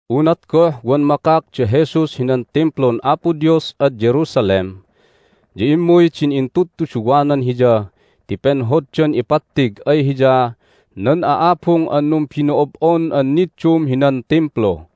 Unat goh wan makak da Jesus hinan Timplun Apo Dios ad Jerusalem ya immuy din intudtuduwanan Hiya ti penhoddan ipattig ay Hiya nan a'abung an numbino'ob'on an niddum hinan Timplu.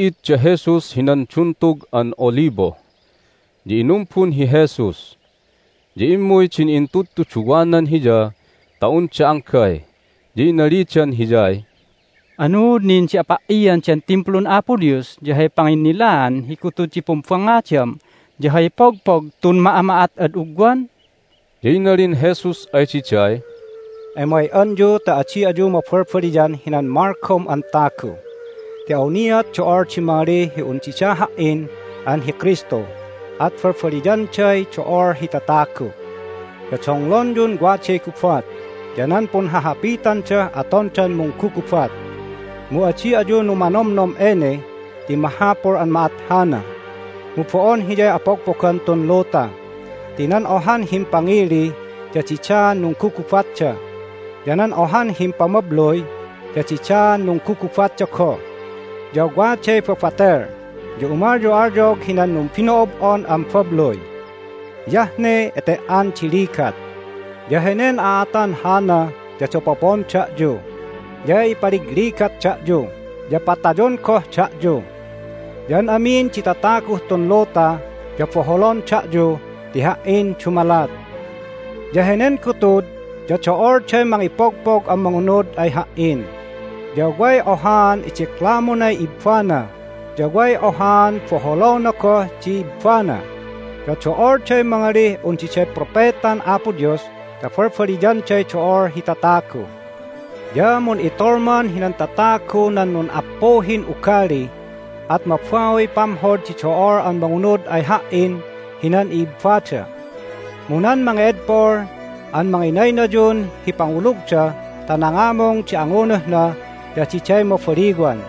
Nunti'id da Jesus hinan Duntug an Olibo, ya inumbun hi Jesus. Ya immuy din intudtuduwanan Hiya ta unda anggay, ya inalidan Hiyay, "Anuud nin di apa"ian den Timplun Apo Dios, ya hay panginnilaan hi gutud di pumbangngadam ya hay pogpog tun ma'ama'at ad ugwan?" Ya inalin Jesus ay diday, "Emay'anyu ta adi ayu mabalbaliyan hinan malgom an tagu. Ti awniat do'ol di mangalih un dida Ha"in an hi Kristu, at balbaliyanday do'ol hi tatagu. Ya donglonyun waday gubat ya nan punhahapitandah atondan munggugubat, mu adi ayu numanomnom ene ti mahapul an ma'at hana, mu bo'on hiyay apogpogan tun luta. Ti nan ohan himpangili ya didaan nunggugubatda, ya nan ohan himpamabluy ya didaan nunggugubatda goh, ya waday babatel, ya umalyo'alyog hinan numbino'ob'on an babluy. Hiyah ne ete"an di ligat. Ya henen a'atan hana ya dapopon da'yu, ya ipaligligat da'yu, ya patayon goh da'yu. Ya an amin di tataguh tun luta ya boholon da'yu ti Ha"in dumalat. Ya henen gutud ya do'olday mangipogpog an mangunud ay Ha"in, ya way ohaan idiklamunay ibbana, ya way ohaan boholona goh di ibbana. Ya do'olday mangalih un diday propetan Apo Dios ta balbaliyanday do'ol hi tatagu. Ya mun'itolman hinan tatagu nan nun'appuhin ugali, at mabauy pamhod di do'ol an mangunud ay Ha"in hinan i'ibbada. Mu nan mange'edpol an manginaynayun hi pangulugda ta nangamung di angunuhna ya diday mabaliwan.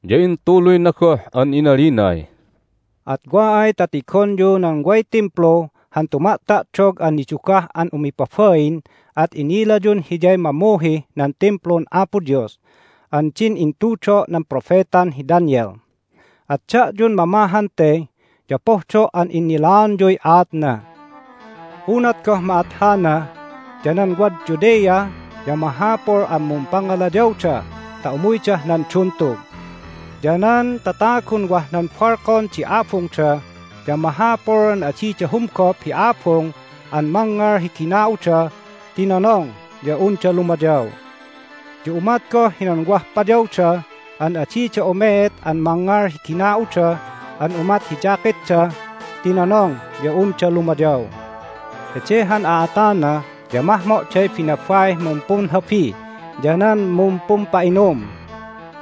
Ya intuluyna goh an inalinay, "At wa ay ta tigonyuh nan way Timplu han tuma'ta'dog an nidugah an umipabain at inilayun hiyay mamuhih nan Timplun Apo Dios an din intudo' nan propetan hi Daniel. At da'yun mamahan te ya pohdo' an innilaonyuy aatna! Unat goh ma'at hana ya nan wad Judea ya mahapul an mumpangalayawda ta umuydah nan duntug. Ya nan tatagun wah nan balkon di abungda ya mahapul an adida humgop hi abung an mangngal hi gina'uda ti nonong ya unda lumayaw. Ya umat goh hinan wah payawda an adida umeet an mangngal hi gina'uda an umat hi jacketda ti nonong ya unda lumayaw. Hede han a'atana ya mahmo'day binabaih mumpunhabi ya nan mumpumpa'inum!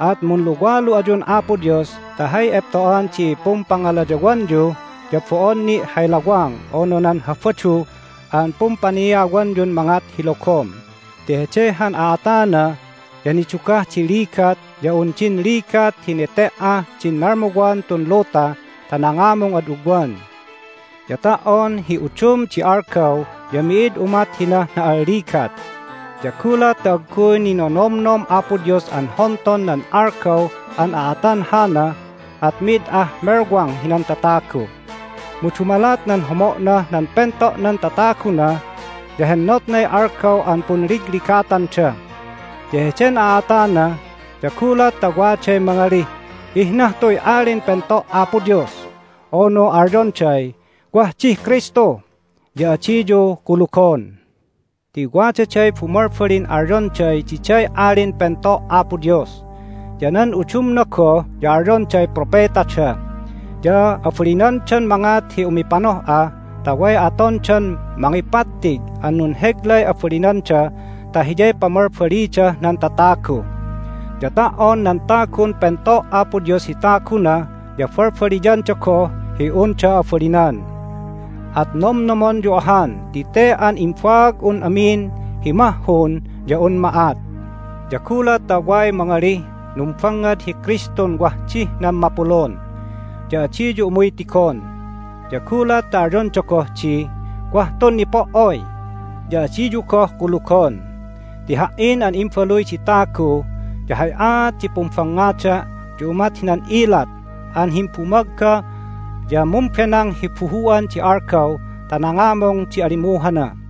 At munluwalu ayun Apo Dios ta hay epto'an di pumpangalayawanyu ya bo'on ni' hay lawang unu nan Habadu an pumpaniawanyun mangat hi logom! Ti hede han a'atana ya nidugah di ligat ya un din ligat hi nete"ah din nalmuwan tun luta ta nangamung ad ugwan. Ya ta"on hi udum di algaw ya mi'id umat hinah na'alligat. Ya gulat ta agguy ninonomnom Apo Dios an honton nan algaw an aatan hana at mid ah melwang hinan tatagu. Mu dumalat nan homo'nah nan pento'nan tataguna ya hennotnay algaw an punligligatanda. Ya heden a'atana ya gulat ta waday mangalih, Ihnah tuy Alin Pento' Apo Dios! unu alyonday, Wah dih Kristu! ya adiyu kulugon. Ti wadaday bumalbalin alyonday diday Alin Pento' Apo Dios, ya nan udumna goh ya alyonday propetada. Ya abalinandan mangat hi umipanoh'a ta way atondan mangipattig an nunheglay abalinanda ta hiyay pamalbalidah nan tatagu. Ya ta"on nan tagun pento' Apo Dios hi taguna ya balbaliyanda goh hi unda abalinan. At nomnomonyu ahan ti te an imbaag'un amin hi mahhun ya un ma'at. Ya gulat ta way mangalih, Numbangngad hi Kristun wah dih nan mapulun! ya adiyu umuy tigon. Ya gulat ta alyonda goh di, Wah tun nipo"oy! ya adiyu goh kulugon. Ti Ha"in an Imbaluy di Tagu ya hay aat di pumbangngada' ya umat hinan ilat an himbumagga ya mumbenang hi bumuhu'an di algaw ta nangamung di alimuhana.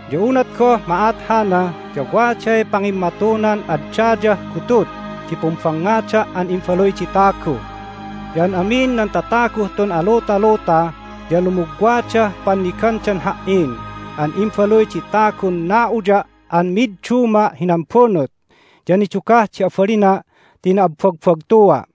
Ya unat goh ma'at hana ya waday pangimmatunan ad dayah gutud di pumbangngada' an Imbaluy di Tagu. Ya an amin nan tataguh tun alutaluta ya lumugwadah pannigandan Ha"in an Imbaluy di Tagun na'uya' an midduma' hinan bunut, ya nidugah di abalina' ti na'abbagbagtua'.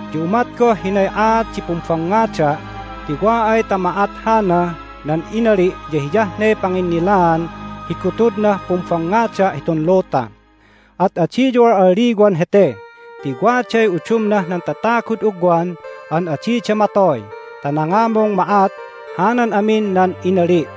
Ya umat goh hinay aat di pumbangngada', ti wa ay ta ma'at hana nan inali' ya hiyah ne panginnilaan hi gutudnah pumbangngada' hitun luta. At adiyu al'alliwan hete ti waday udumnah nan tatagud ugwan an adida matoy ta nangamung ma'at hanan amin nan inali'.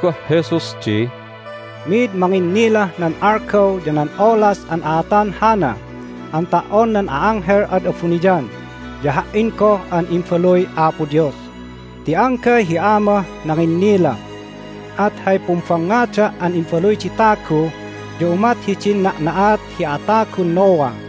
Ya inalin goh Jesus di, "Mid manginnilah nan algaw ya nan olas an a'atan hana an ta"on nan a'anghel ad abuniyan ya Ha"in goh an Imbaluy Apo Dios, ti anggay hi Amah nanginnila. At hay pumbangngada' an Imbaluy di Tagu ya umat hidin na'na'at hi atagun Noah.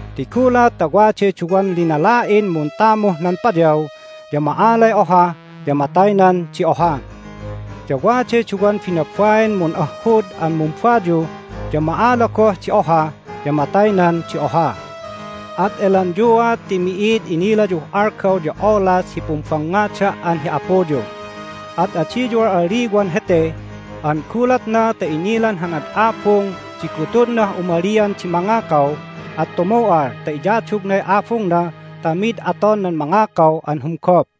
Ti gulat ta waday duwan linala'in muntamuh nan payaw ya ma'alay oha, ya mataynan di oha. Ya waday duwan binabain mun'ahhud an mumbayu ya ma'ala goh di oha, ya mataynan di oha. At elanyuat ti mi'id inilayuh algaw ya olas hi pumbangngada' an hi apuyu. At adiyu al'alliwan hete an gulatna ta inilan han ad abung di gutudnah umalian di mangakaw at tumu'al ta iyadugnay abungna ta mid aton nan mangakaw an humgup.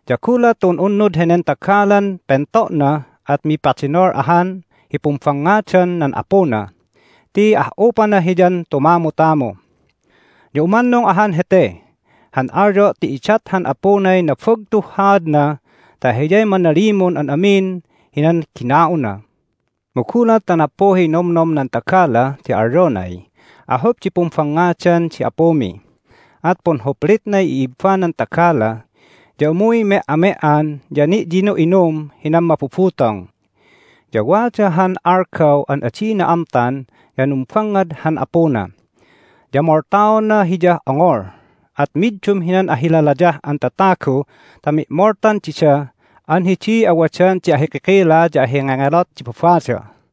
Ya gulat ta un'unnud henen tagalan pento'na at mipadenol ahan hi pumbangngadan nan apuna ti ah'upana hiyan tumamutamu! Ya umannung ahan hete han alyo' ti idat han apunay nabagtuh haadna ta hiyay manalimun an amin hinan gina'una. Mu gulat ta nappuhiy nomnom nan tagala ti alyonay, Ahup di pumbangngadan di apumi! at punhuplitnay i'ibbanan tagala, ya umuy me"ame"an ya ni'yinu'inum hinan mabubutong. Ya wada han algaw an adina amtan ya numbangngad han apuna, ya moltaona hiyah ongol, at middum hinan ahilalayah an tatagu ta mi'moltan dida an hidiy awadan di ahikikila ya ahingengelot di babada."